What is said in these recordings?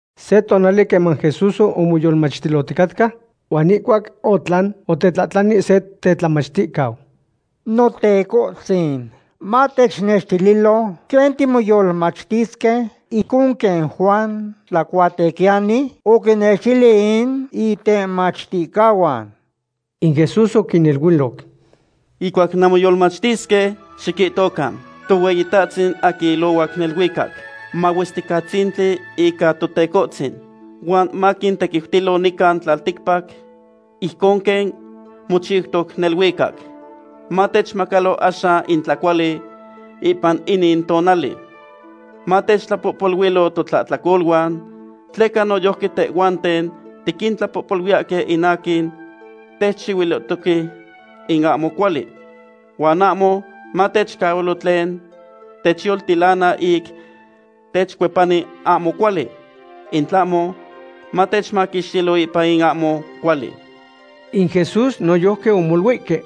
Se tonali queman Jesús omoyolmachtiloticatca, huan ihcuac otlan, otetlahtlani se tetlamachticau: ―Notecohtzin, matechnextililo quen timoyolmachtisque ijcon quen Juan Tlacuatequiyani oquinnextili in itemachticahuan. In Jesús oquiniluiloc: ―Ihcuac nanmoyolmachtisque, xiquihtocan: Tohueyitahtzin aquin ilohuac neluicac, mahuesticatzintli ica Tetocahtzin. Huan maquintequiutilo nican tlalticpac, ijcon quen mochiutoc neluicac. Matechmacalo axan in tlacuali ipan inin tonali. Matechtlapohpoluilo totlahtlacoluan, tleca noyojqui tehhuanten tiquintlapohpoluiyahque in aquin techchihuilihtoque in ahmo cuali. Huan ahmo matechcahualo tlen techyoltilana ic techcuepani ahmo cuali, in tlahmo matechmaquixtilo ipan in ahmo cuali. In Jesús noyojqui omoluihque: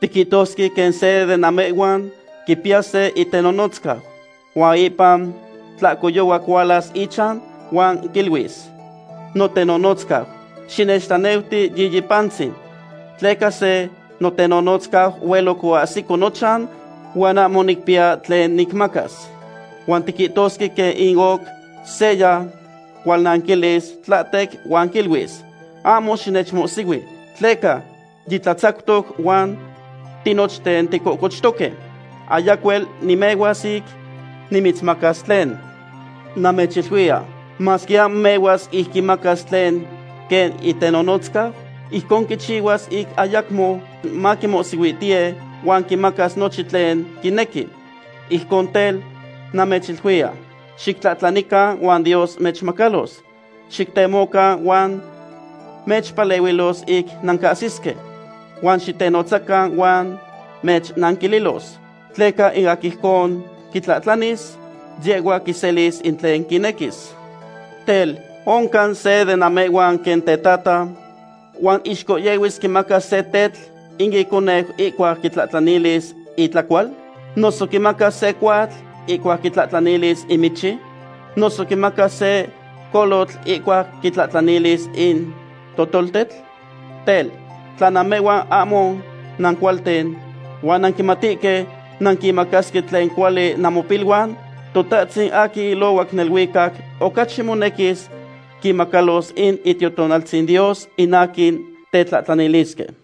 ―Tiquihtosque quen se de namehhuan quipiya se itenonotzcau, huan ipan tlahcoyohuac hualas ichan huan quiluis: “Notenonotzcau, xinechtlaneuti yiyi pantzin, tleca se notenonotzcau hueloc oahsico nochan huan ahmo nicpiya tlen nicmacas.” Huan tiquihtosque quen in oc seya cualnanquilis tlahtec huan quiluis: “Ahmo xinechmohsihui, tleca yitlatzactoc huan tinochten ticochtoque. Ayacuel nimehuas ic nimitzmacas tlen.” Namechiluiya, masque ahmo mehuas ic quimacas tlen quen itenonotzcau, ijcon quichihuas ic ayacmo maquimohsihuitiye huan quimacas nochin tlen quinequi. Ijcon tel, namechiluiya, xictlahtlanican huan Dios mechmacalos. Xictemocan, huan mechpalehuilos ic nancahsisque. Huan xitenotzacan huan mechnanquililos. Tleca in aquin ijcon quitlahtlanis, yehhua quiselis in tlen quinequis. ’Tel, ¿oncan se de namehhuan quen tetata, huan ixcohyehuis quimacas se tetl in iconeu ihcuac quitlahtlanilis itlacual? ¿Noso quimacas se cohuatl ihcuac quitlahtlanis in michi? ¿Noso quimacas se colotl ihcuac quitlahtlanis in totoltetl? Tel, tla namehhuan ahmo nancualten, huan nanquimatihque nanquimacasque tlen cuali namopiluan, Totahtzin aquin ilohuac neluicac ocachi monequis quinmacalos in Itiotonaltzin Dios in aquin tetlahtlanilisque.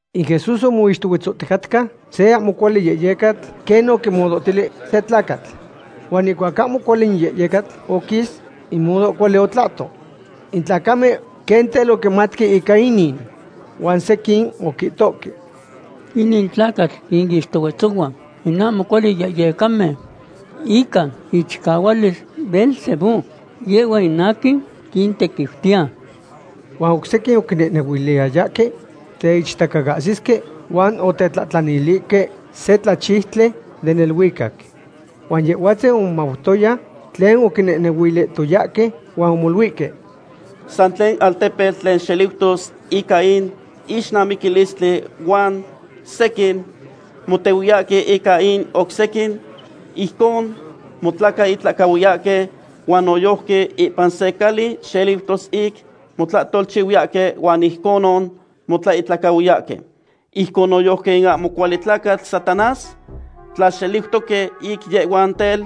In Jesús omixtohuetzohticatca se ahmo cuali yehyecatl quen oquimudohtili se tlacatl. Huan ihcuac in ahmo cuali yehyecatl oquis, in mudo cuali otlahto. In tlacamen quen tel oquimatque ica inin. Huan sequin oquihtoque: ―Inin tlacatl quinixtohuetzohua in ahmo cuali yehyecamen ica ichicahualis Beelzebú; yehhua in aquin quintequiutiya. Huan oc sequin oquinequiyayahque teichtacaahsihque, huan otetlahtlanilihque se tlachiutli den neluicac. Huan Yehhuatzin omomautoya tlen oquinehnehuilihtoyahque huan omoluihque: ―San tlen altepetl tlen xeliutos ica in ixnamiquilistli huan sequin motehuiyahque ica in oc sequin, ijcon motlacaihtlacahuiyahque. Huan noyojqui ipan se cali xeliutos ic motlahtolchihuiyahque huan ijconon motlacaihtlacahuiyahque. Ijcon noyojqui in ahmo cuali tlacatl Satanás, tla xeliutosque ic yehhuan tel,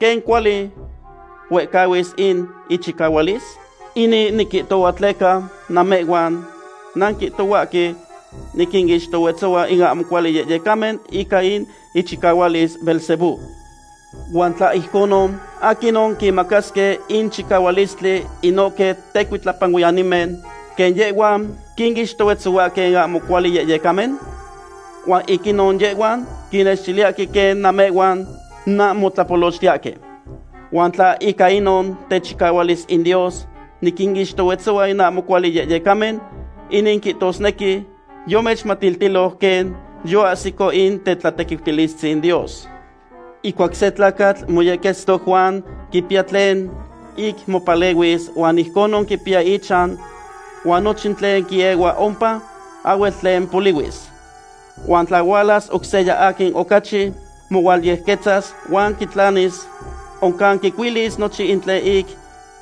¿quen cuali huehcahuis in ichicahualis? Inin niquihtohua tleca namehhuan nanquihtohuahque niquinixtohuetzohua in ahmo cuali yehyecamen ica in ichicahualis Beelzebú. Huan tla ijconon, ¿aquinon quinmacasque in chicahualistli inohque tecuitlapanuiyanimen, quen yehhuan quinixtohuetzohuahque in ahmo cuali yehyecamen? Huan ic inon yehhuan quinextiyahque quen namehhuan nanmotlapolochtihtoque. Huan tla ica inon techicahualis in Dios niquinixtohuetzohua in ahmo cuali yehyecamen, inin quihtosnequi yomechmatiltiloc quen yoahsico in tetlatequiutilistzin Dios. ’Ihcuac se tlacatl moyequetztoc huan quipiya tlen ic mopalehuis huan ijcon quixpiya ichan huan nochin tlen quiehua ompa, ahhuel tlen polihuis. Huan tla hualas oc seya aquin ocachi mohualyequetztas, huan quitlanis, oncan quicuilis nochin tlen ic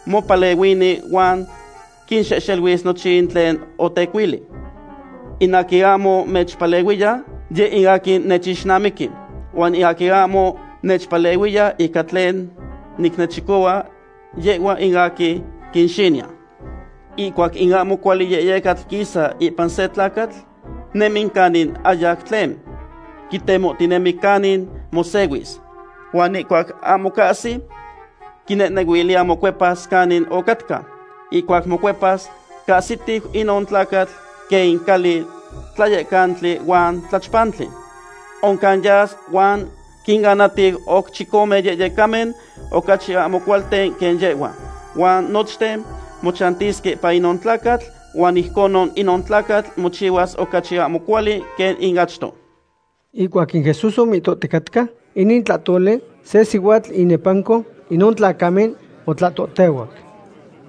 mopalehuini huan quinxehxeluis nochin tlen otecuili. ’In aquin ahmo nechpalehuiya, yeh in aquin nechixnamiqui. Huan in aquin ahmo nechpalehuiya ica tlen nicnechicohua, yehhua in aquin quinxiniya. ’Ihcuac in ahmo cuali yehyecatl quisa ipan se tlacatl, nemi canin ahyac tlen. Quitemohtinemi canin mosehuis, huan ihcuac ahmo cahsi, quinehnehuiliya mocuepas canin ocatca. Ihcuac mocuepas, cahsitiu inon tlacatl quen in cali tlayectlalili huan tlachpantli. Oncan yas huan quinanatiu oc chicome yehyecamen ocachi ahmo cualten quen yehhua, huan nochten mochantisque ipan inon tlacatl huan ijconon inon tlacatl mochihuas ocachi ahmo cuali quen in achto. Ihcuac in Jesús omihtohticatca inin tlahtoli, se sihuatl inepanco inon tlacamen otlahtohtehuac: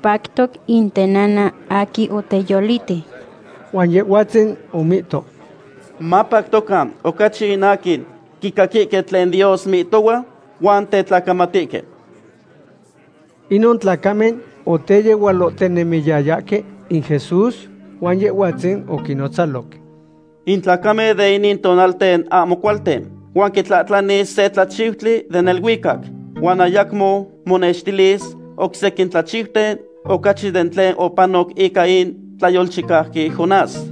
―Pactoc in tenana aquin oteyoliti. Huan Yehhuatzin omihto: ―Mapactocan ocachi in aquin quicaquihque tlen Dios mihtohua huan tetlacamatihque. Inon tlacamen oteyehualohtinemiyayahque in Jesús, huan Yehhuatzin oquinnonotzaloc: ―In tlacamen de inin tonalten ahmo cualten, huan quitlahtlani se tlachiutli den neluicac. Huan ayacmo motenextilis oc sequin tlachiuten ocachi den tlen opanoc ica in tlayolchicauqui Jonás.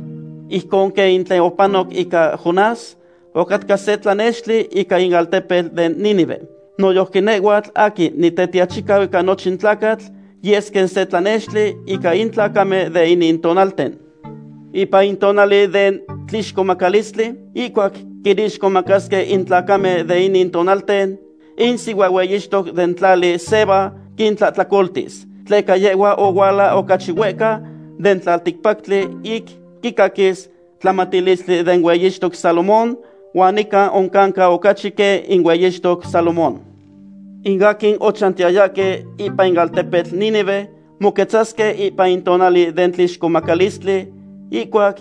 Ijcon quen in tlen opanoc ica Jonás ocatca se tlanextili ica in altepetl den Nínive, noyojqui nehhuatl aquin Nitetiachicau ica nochin tlacatl yes quen se tlanextili ica in tlacamen de inin tonalten. Ipan in tonali den tlixcomacalistli, ihcuac quinixcomacasque in tlacamen de inin tonalten, in sihuahueyixtoc den tlali Seba quintlahtlacoltis. Tleca yehhua ohuala ocachi huehca den tlalticpactli ic quicaquis tlamatilistli den hueyixtoc Salomón, huan nican oncanca ocachi quen in hueyixtoc Salomón. In aquin ochantiyayahque ipan in altepetl Nínive moquetzasque ipan in tonali den tlixcomacalistli ihcuac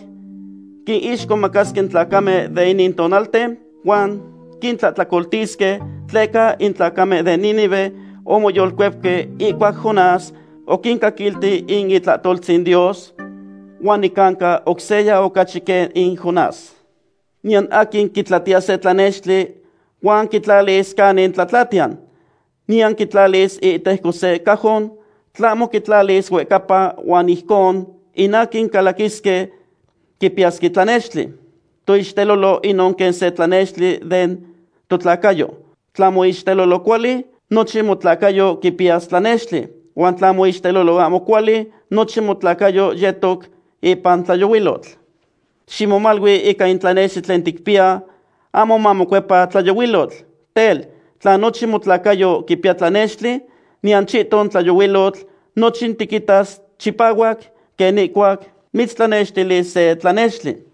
quinixcomacasque in tlacamen de inin tonalten huan quintlahtlacoltisque, tleca in tlacamen den Nínive omoyolcuepque ihcuac Jonás oquincaquilti in itlahtoltzin Dios. Huan nicanca oc seya ocachi quen in Jonás. ’Niyan aquin quitlatiya se tlanextli huan quitlalis canin tlatlatiyan, niyan quitlalis iihtejco se cajon, tlahmo quitlalis huehcapa huan ijcon in aquin calaquisque quipiyasque tlanextli. Toixtelolo inon quen se tlanextli den totlacayo. Tla moixtelolo cuali, nochin motlacayo quipiya tlanextli. Huan tla moixtelolo ahmo cuali, nochin motlacayo yetoc ipan tlayohuilotl. Ximomalui ica in tlanextli tlen ticpiya ahmo mamocuepa tlayohuilotl. Tel, tla nochin motlacayo quipiya tlanextli, niyan chihton tlayohuilotl, nochin tiquitas chipahuac quen ihcuac mitztlanextilis se tlanextli.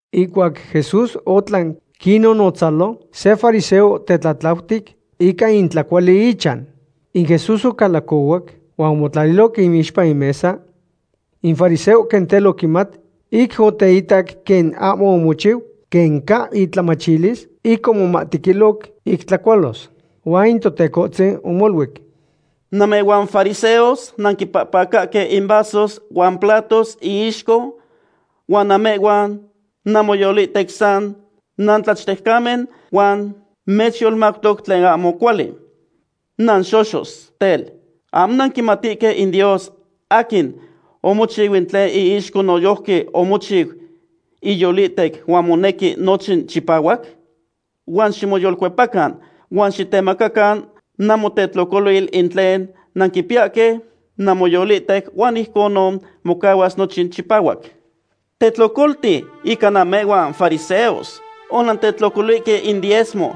Ihcuac Jesús otlan quinnonotzalo, se fariseo otetlatlautic ica in tlacuali ichan. In Jesús ocalacohuac huan omotlaliloc iixpa in mesa. In fariseo quen tel oquimat ic oteitac quen ahmo omochiu quen ca intlamachilis ic omomahtequiloc ic tlacualos. Huan in Totecohtzin omoluic: ―Namehhuan fariseos nanquipahpacahque in vasos huan platos iixco huan namehhuan namoyolihtec san nantlachtejcamen huan mechyolmautoc tlen ahmo cuali. ¡Nanxoxos! Tel, ¿ahmo nanquimatihque in Dios aquin omochiu in tlen iixco noyojqui omochiu iyolihtec huan monequi nochin chipahuac? Huan ximoyolcuepacan huan xictemacacan namotetlocolil in tlen nanquipiyahque namoyolihtec huan ijcon mocahuas nochin chipahuac. ’¡Tetlocolti ica namehhuan fariseos! Onantetlocolihque in diezma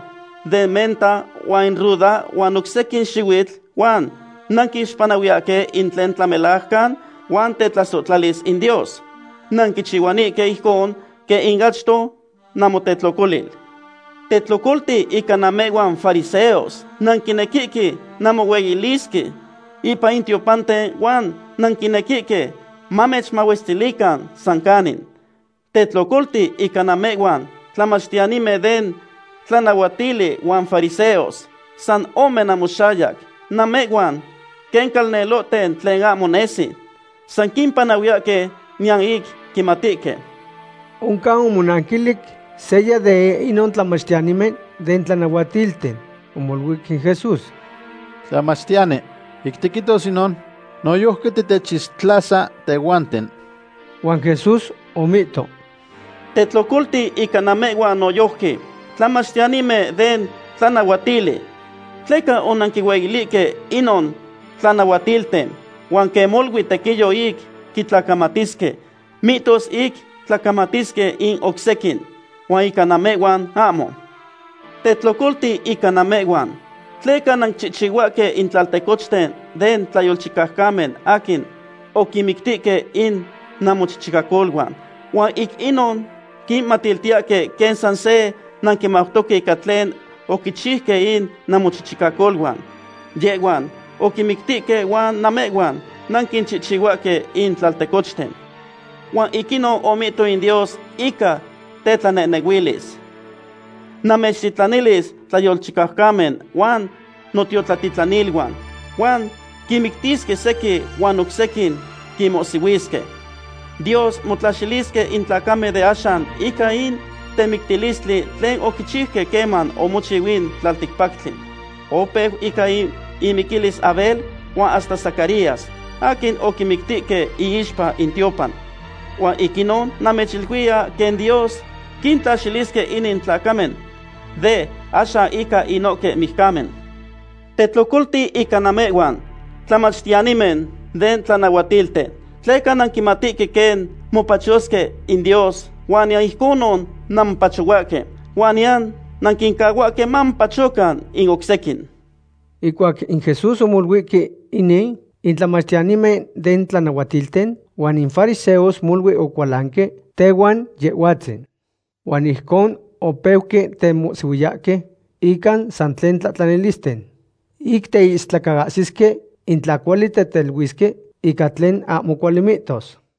den menta huan in ruda huan oc sequin xihuitl huan nanquixpanahuiyahque in tlen tlamelajcan huan tetlasohtlalis in Dios. Nanquichihuanihque ijcon quen in achto namotetlocolil. ’¡Tetlocolti ica namehhuan fariseos! Nanquinequihque nanmohueyilisque ipan in tiopanten huan nanquinequihque mamechmahuestilican san canin. ’¡Tetlocolti ica namehhuan, tlamachtiyanimen den tlanahuatili huan fariseos, san ome namoxayac! Namehhuan quen tlaltecochten tlen ahmo nesi. San quimpanahuiyahque niyan ic quimatihque. Oncan omonanquilic seya de inon tlamachtiyanimen den tlanahuatilten. Omoluic in Jesús: ―Tlamachtiyani, ic tiquihtos inon, noyojqui titechixtlasa tehhuanten. Huan Jesús omihto: ―¡Tetlocolti ica namehhuan noyojqui, tlamachtiyanimen den tlanahuatili! Tleca onanquihueyilihque inon tlanahuatilten, huan quen molui tequiyo ic quitlacamatisque, mihtos ic tlacamatisque in oc sequin. Huan ica namehhuan, ahmo. ’¡Tetlocolti ica namehhuan! Tleca nanquichihchihuahque in tlaltecochten den tlayolchicaucamen aquin oquinmictihque in namochichicacoluan. Huan ic inon quinmatiltiyahque quen san se nanquimautoque ica tlen oquichiuque in namochichicacoluan. Yehhuan oquinmictihque huan namehhuan nanquichihchihuahque in tlaltecochten. ’Huan ic inon omihto in Dios ica tetlanehnehuilis: “Namechtitlanilis tlayolchicaucamen huan notiotlatitlaniluan, huan quinmictisque sequin huan oc sequin quinmohsihuisque.” Dios motlaxilisque in tlacamen de axan ica in temictilistli tlen oquichiuque queman omochiu in tlalticpactli. Opeu ica in imiquilis Abel huan hasta Zacarías, aquin oquimictihque iixpa in tiopan. Huan ic inon namechiluiya quen Dios quintlaxilisque inin tlacamen de axan ica inohque mijcamen. ’¡Tetlocolti ica namehhuan, tlamachtiyanimen den tlanahuatilten! Tleca nanquimatihque quen mopachosque in Dios huan niyan ijconon nanmopachohuahque huan niyan nanquincahuahque mamopachocan in oc sequin. Ihcuac in Jesús omoluihque inin, in tlamachtiyanimen den tlanahuatilten huan in fariseos molui ocualanque tehuan Yehhuatzin. Huan ijcon opeuque temohsihuiyahque ica san tlen tlahtlanilisten. Ic teistlacaahsisque in tla cuali teteluisque ica tlen ahmo cuali mihtos.